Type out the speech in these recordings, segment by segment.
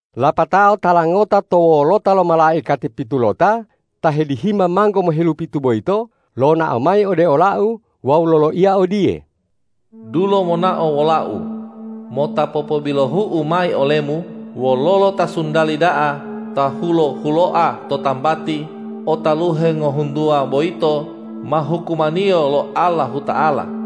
Lapatao tala ngota to wolota lo malaikati pitulota ta hedihima manggo mohelupitu boyito lonao mayi ode olau wawu loloiya odiye,”Dulo monao wolau, mota popobilohu'u mayi olemu wololo ta sundali da'a ta hulo-huloa to tambati o taluhe ngohuntuwa boyito ma hukumaniyo lo Allahuta'ala.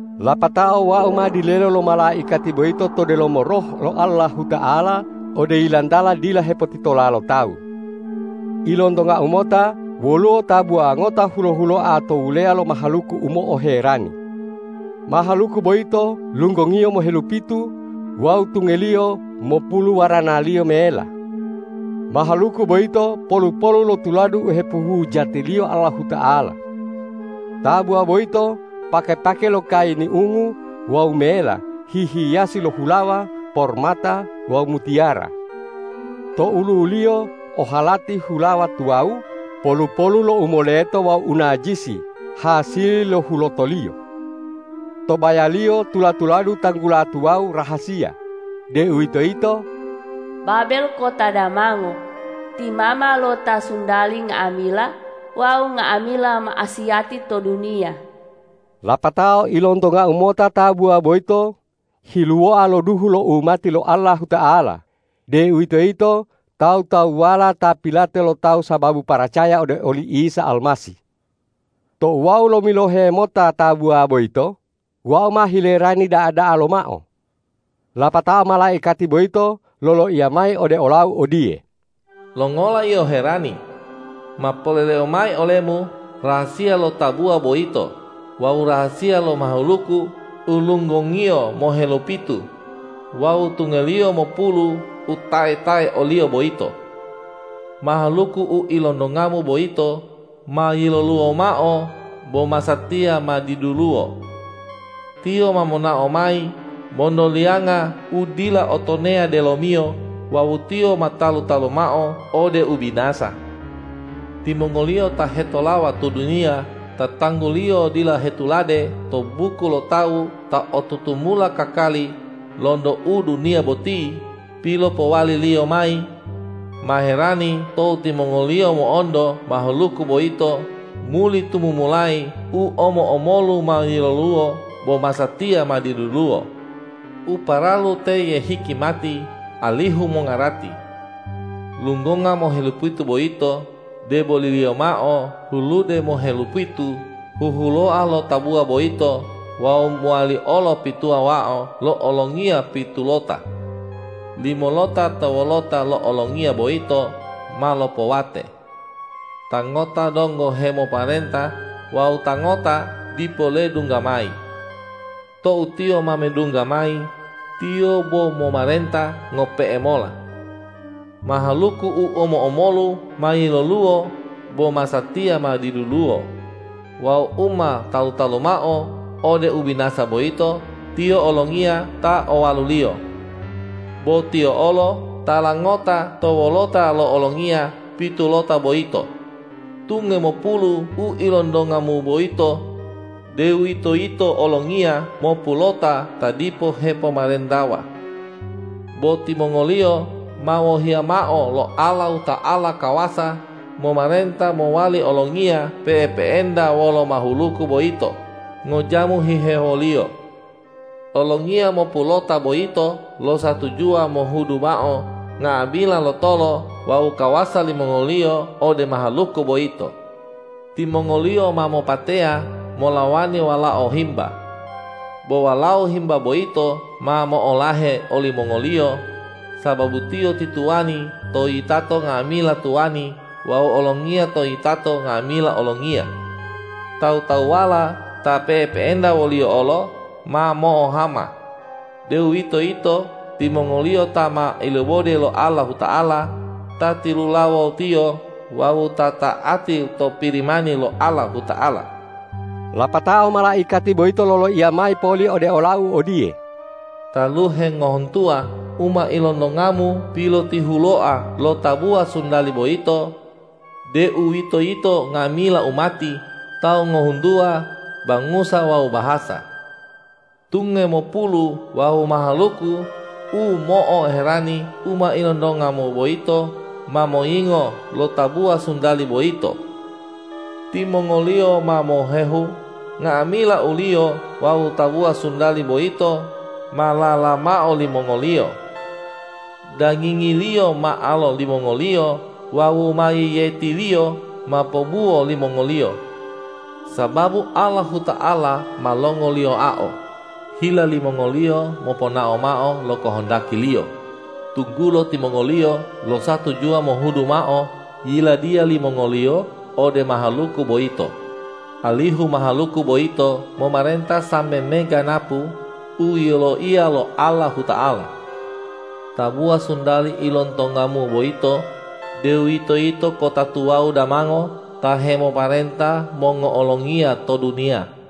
Lapatao wau ma dilelo lo malaikati boyito to delomo Roh lo Allahuta'ala ode yilantala dila hepotitola lo tawu. Ilontongau mota woluwo tabuwa ngota hulo-huloa to wuleya lo mahaluku u mo'oherani. Mahaluku boyito lunggongiyo mohelupitu wawu tungeliyo mopulu waranaliyo mela. Mahaluku boyito polu-polu lo tuladu u hepohujatiliyo Allahuta'ala. Tabuwa boyito pake-pake lo kayini ungu wawu mela hihiyasi lo hulawa, pormata wawu mutiyara. To olu'uliyo o halati hulawa tuwawu polu-polu lo u moleto wawu u najisi hasili lo hulotoliyo. To bayaliyo tula-tuladu tanggula tuwawu rahasiya, deuwitoyito: Babel kota damango, ti mama lo ta suntali nga'amila wawu nga'amila ma'asiyati to duniya. Lapatao ilontongau mota tabuwa boyito hiluwoa lo duhu lo umati lo Allahuta'ala, deuwitoyito tawu-tawuwala ta pilate lo tawu sababu paracaya ode oli Isa Almasih. Tou wau lomilohe mota tabuwa boyito, wau ma hilerani da'a-da'a lomao. Lapatao malaikati boyito loloiya mayi ode olau odiye,”Longola yio herani? Ma poleleu mayi olemu rahasiya lo tabuwa boyito wawu rahasiya lo mahaluku u lunggongiyo mohelupitu wawu tungeliyo mopulu u tae-tae oliyo boyito. Mahaluku u ilontongamu boyito ma yiloluwo mao bo masatiya ma diduluwo. Tiyo ma monao mayi monto liyanga u dila o tonea delomiyo wawu tiyo ma talu-talu mao ode ubinasa. Timongoliyo ta hetolawa to duniya ta tangguliyo dila hetulade to buku lo tawu ta o tutumula kakali lonto u duniya boti pilopowaliliyo mayi, ma herani tou timongoliyo mo'onto mahaluku boyito muli tumumulayi u omo-omolu ma yiloluwo bo masatiya ma diduluwo. U paralu teye hikimati alihu mongarati. Lunggonga mohelupitu boyito, deboliliyo mao hulude mohelupitu huhuloa lo tabuwa boyito wawu mowali olo pituwa mao lo olongiya pitulota. Limolota to wolota lo olongiya boyito ma lopowate. Ta ngota donggo hemomarenta wawu ta ngota dipo ledungga mayi. Tou tiyo ma medungga mayi, tiyo bo momarenta ngope'e mola. Mahaluku u omo-omolu ma yiloluwo bo masatiya ma diduluwo wawu u ma talu-talu mao ode ubinasa boyito, tiyo olongiya ta owaluliyo. Bo tiyo olo tala ngota to wolota lo olongiya pitulota boyito. Tunge mopulu u ilontongamu boyito, deuwitoyito olongiya mopulota ta dipo hepomarentawa. Bo timongoliyo ma wohiya mao lo Allahuta'ala kawasa momarenta mowali olongiya pe'epe'enta wolo mahaluku boyito ngojamu hihewoliyo. Olongiya mopulota boyito losatujuwa mohudu mao nga'amila lotolo wawu kawasa limongoliyo ode mahaluku boyito. Timongoliyo ma mopateya molawani Walao Himba. Bo Walao Himba boyito ma mo'olahe olimongoliyo, sababu Tiyo ti Tuwani to yitato nga'amila tuwani wawu Olongiya to yitato nga'amila olongiya. Tawu-tawuwala ta pe'epe'enta wo-Liyo olo ma mo'ohama, deuwitoyito timongoliyo ta ma ilibode lo Allahuta'ala, ta tilulawo-Tiyo wawu ta ta'ati to Pirimani lo Allahuta'ala.” Lapatao malaikati boyito loloiya mayi poli ode olau odiye,”Taluhe ngohuntuwa u ma ilontongamu pilotihuloa lo tabuwa suntali boyito, deuwitoyito nga'amila umati, tawu ngohuntuwa, bangusa wawu bahasa. Tunge mopulu wawu mahaluku u mo'oherani u ma ilontongamu boyito ma moyingo lo tabuwa suntali boyito. Timongoliyo ma mohehu nga'amila uliyo wawu tabuwa suntali boyito ma lala mao limongoliyo. Dagingiliyo ma alo limongoliyo wawu mayiyetiliyo ma pobuwo limongoliyo. Sababu Allahuta'ala ma longoliyoao hila limongoliyo moponao mao lo kohondaki-Liyo, tunggulo timongoliyo losatujuwa mohudu mao yiladiya limongoliyo ode mahaluku boyito, alihu mahaluku boyito momarenta sambe meganapu u yiloiya lo Allahuta'ala. Tabuwa suntali ilontongamu boyito, deuwitoyito kota tuwawu damango ta hemomarenta mongo'olongiya to duniya.”